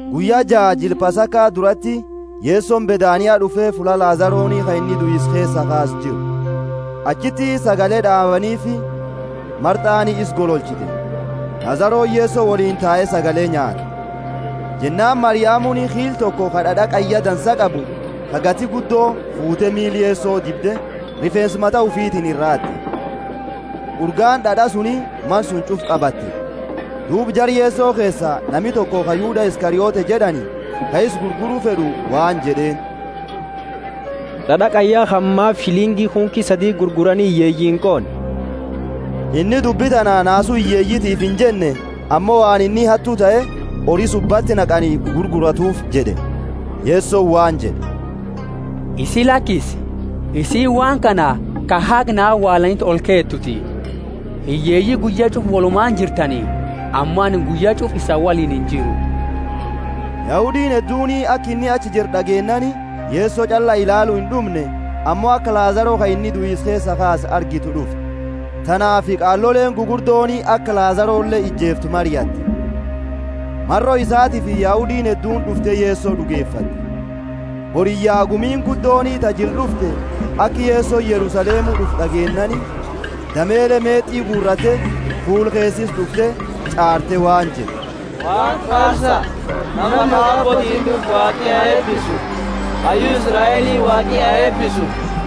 Guyya jaa jila Pasaka durati, Yesoni Bethania d'ufe, fulla Lazaroni ka inni duisa keesaa kaase jiru. Achiti sagale d'aabaniifi, Marthani isa gololchite; Lazaroni Yeso woliini tae sagale nyaate. Jennaani Mariamuni kiila toko ka d'ad'a qayya dansa qabu, ka gati guddo, fuute miila Yeso dibde, rifeensa mata ufiitini iraa haat'e. Urgaani d'ad'a suni mana suni ch'ufa qabatte. Duuba jara Yeso keesa, nami toko ka Yuda Iskariote jed'ani, ka isa gurguru fed'u, waan jed'eeni, D'ad'a qayya kana maafi shilingi kunki sadi gurgurani hiyyeeyii inqoonne? Inni dubbi tana naasu hiyyeeyitiifi injenne, ammo waan inni hattu tahe, hori subbati naqani guuratuufi jed'e. Yeso waan jed'e, Isi lakisi, isiini waan kana ha haga na awaalaniti olkeetuuti. Hiyyeeyi guyya ch'ufa wolumaani jirtani, ammo anini guyya ch'ufa isani woliini injiru. Yahudiini hedduuni aka inni achi jiru d'ageennaani, Yeso ch'alla ilaalu ind'umne, ammo aka Lazaro, ka inni duisa keesaa kaase, argitu d'ufte. Tanaafi qaaloleeni gugurdooni aka Lazarole ijeeftu mariatte. Maro isatiifi Yahudiini hedduuni d'ufte Yeso d'ugefatte. Boriyya, gumiini guddooni ta jila d'ufte, aka Yesoni Yerusalemu d'ufu d'ageennaani, damele meet'i guuratte, fuula keesa isa d'ufte, ch'aarte, waan jette Waaqa faarsa, nama maqa abbootiini d'ufu Waaqi ha eebisu! Hayyu Israeli Waaqi ha eebisu.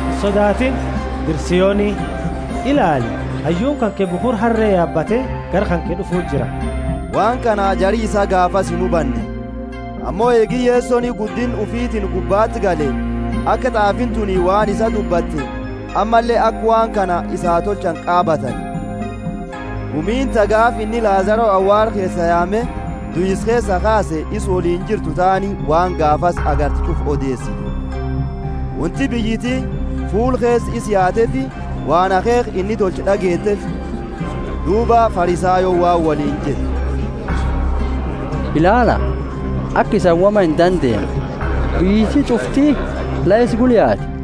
Insodaatini, dira Sioni! Ilaali, hayyuuni kanke bukhura harre yaabate gara kanke d'ufu jira. Waan kana jari isaa gaafasi inhubanne; ammo eegi Yesoni guddinna ufiitini gubbaati gale, aka t'aafiini tuni waan isaa dubbate, ammalle aka waan kana isaa tolchani qaabatani. Gumiini ta gaafa inni Lazaro awaala keesaa yaame duisa keesaa kaase isa woliini jirtu taani waan gaafasi agarte ch'ufa odeesite. Wonti biyyiti fuula keesa isa yaateefi waan akheekha inni tolche d'ageeteefi. Duuba Farisayooni waan woliini jette, Ilaala, aka isani woma indandeenne, biyyiti ch'ufti la isa gula yaate.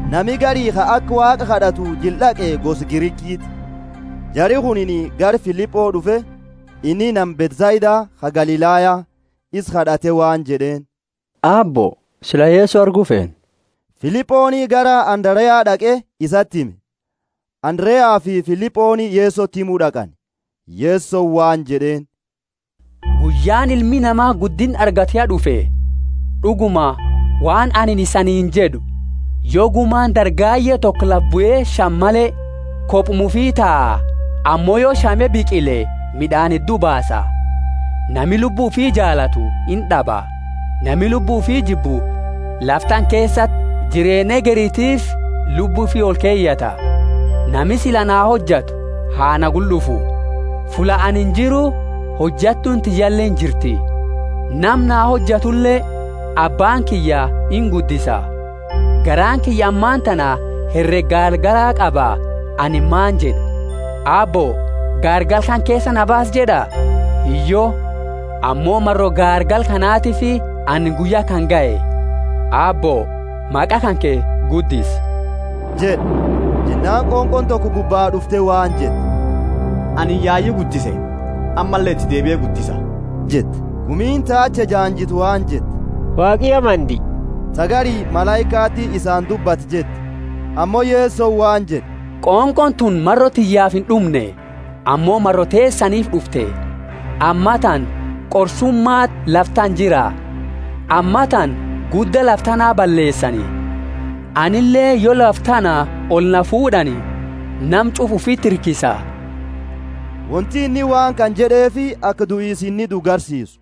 Nami gari ka aka Waaqa kad'atu jila d'aqe gosa Grikiiti. Jari kunini gara Filipo d'ufe (inni nama Bethsaida ka Galilaya) isa kad'ate waan jed'eeni, Aabbo, sila Yeso argu feena. Filiponi gara Andarea d'aqe isati hime, Andareafi Filiponi Yesoti himu d'aqani. Yesoni waan jed'eeni, Guyyaani Ilmi Nama guddinna argatu ya d'ufe. D'uguma waan anini isaniini jed'u, yo gumani dargaye toko lafa bue shame male, kobuma ufi taa, ammo yo shame biqile mid'aani heddu baasa. Nami lubbu ufi jaalatu ind'aba; nami lubbu ufi jibbu, lafa tana keesati, jireenna hegeritiifi lubbu ufi olkeyata. Nami sila na hojatu ha na gula d'ufu; fulla anini jiru hojattuuni tiyyaleeni jirti jira. Nama na hojatule Abbaani kiyya inguddisa. Garaani kiyya ammatana herega gaargala qaba anini maani jed'a? Aabbo, gaargala kana keesaa na baasi jed'a? Hiyyo. Ammo maro gaargala kanatifi anini guyya kana gahe. Aabbo, maqa kanke guddisi! jed'a. Jennaani qonqooni toko gubbaa d'ufte waan jette, Anini yayu guddise, ammalle iti deebie guddisa jette. Gumiini ta achi ejaanjitu waan jette, Waaqi ya mandie. Ta gari, Malaikati isaani dubbate jette. Ammo Yesoni waan jed'e, Qonqooni tuni maro tiyyaafi ind'umne, ammo maro teesaniifi d'ufte. Ammatana qorsumaati lafa tana jira; ammatana gudda lafa tana balleesani. Anileeni, yo lafa tana oli na fuud'ani, nama ch'ufa ufiti hirkisa. Wonti inni waan kana jed'eefi aka duisa inni duu garsiisu.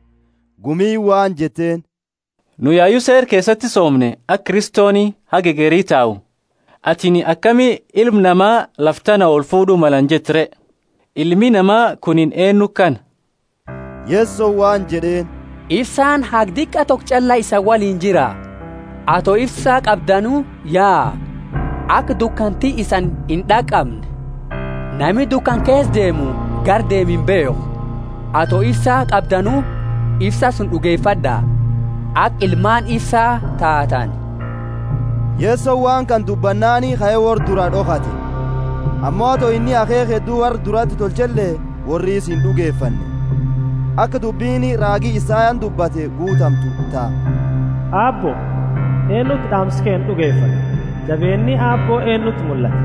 Gumiini waan jetteeni, Nu yayu Seera keesati soomne aka Kristoni haga hegeri tau. Atini akami Ilma Nama lafa tana olfuud'u malani jette re? Ilmi Nama kunini eennu kana? Yesoni waan jed'eeni, Ifsaani haga diqa toko ch'alla isani woliini jira; ato ifsa qabdanu yaa, aka dukanti isani ind'aqamne. Nami dukana keesa deemu gara deemu imbeekhu. Ato ifsa qabdanu, ifsa suni d'ugefad'a, aka ilmaani ifsaa taatani. Yahudi ta ind'ugefanne Yesoni waan kana dubbannaani kae worra duraa d'okhate. Ammo ato inni akheekha heddu worra durati tolchele, worri isa ind'ugefanne, aka dubbini raagi Isayani dubbate guutamtu ta, Aabbo, eennuti d'aamsa keennaa d'ugefate? Jabeenni Aabbo eennuti mullate?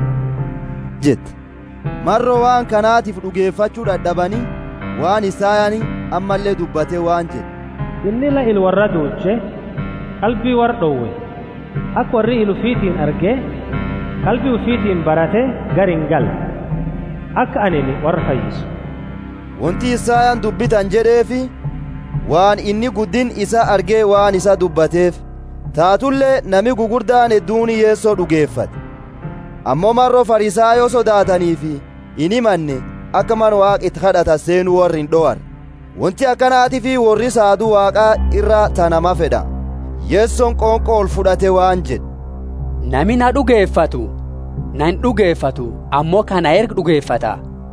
jette. Maro waan kanatifi d'ugefachu dad'abani, waan Isayani ammalle dubbate waan jed'e, Inni la ila worraa duuche, qalbi worra d'owe, aka worri ila ufiitini arge, qalbi ufitiini barate, gara ingalle, aka anini worra fayyisu. Wonti Isayani dubbi tana jed'eefi, waan inni guddinna isaa arge waan isaa dubbateefi. Taatule nami gugurdaani hedduuni Yeso d'ugefate; ammo maro Farisayo sodaataniifi inhimanne aka mana Waaqa iti kad'atani seenu worra ind'owarre. Wonti akanatiifi worri saadu Waaqa iraa ta namaa fed'a. Yesoni qonqo olfud'ate waan jed'e, Nami na d'ugefatu, na ind'ugefatu, ammo ka na erge d'ugefata.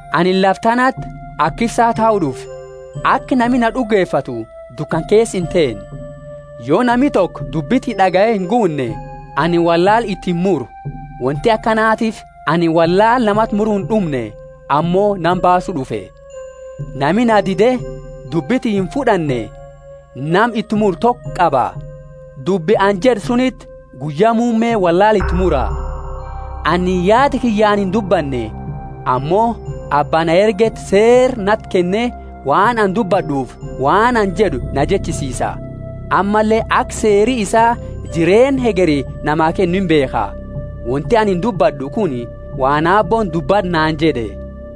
Anini lafa tanati aka ifsa tahu d'ufe, aka nami na d'ugefatu dukana keesa inteenne. Yo nami toko dubbi tiyya d'agaye inguunne, anini wollaala iti imuru. Wonti akanatiifi anini wollaala namati muru ind'umne, ammo nama baasu d'ufe. Nami na dide dubbi tiyya imfud'anne, nama iti muru toko qaba. Dubbi anini jed'e suniti guyya muumme wollaala iti mura. Anini yaada kiyyaani indubbanne, ammo Abba na ergeti seera nati kenne waan ani dubbad'uufi waan ani jed'u na jechisiisa. Ammalle aka seeri isaa jireenna hegeri namaa kennu imbeekha. Wonti anini dubbad'u kuni waan Aabbooni, Dubbad'u naani jed'e.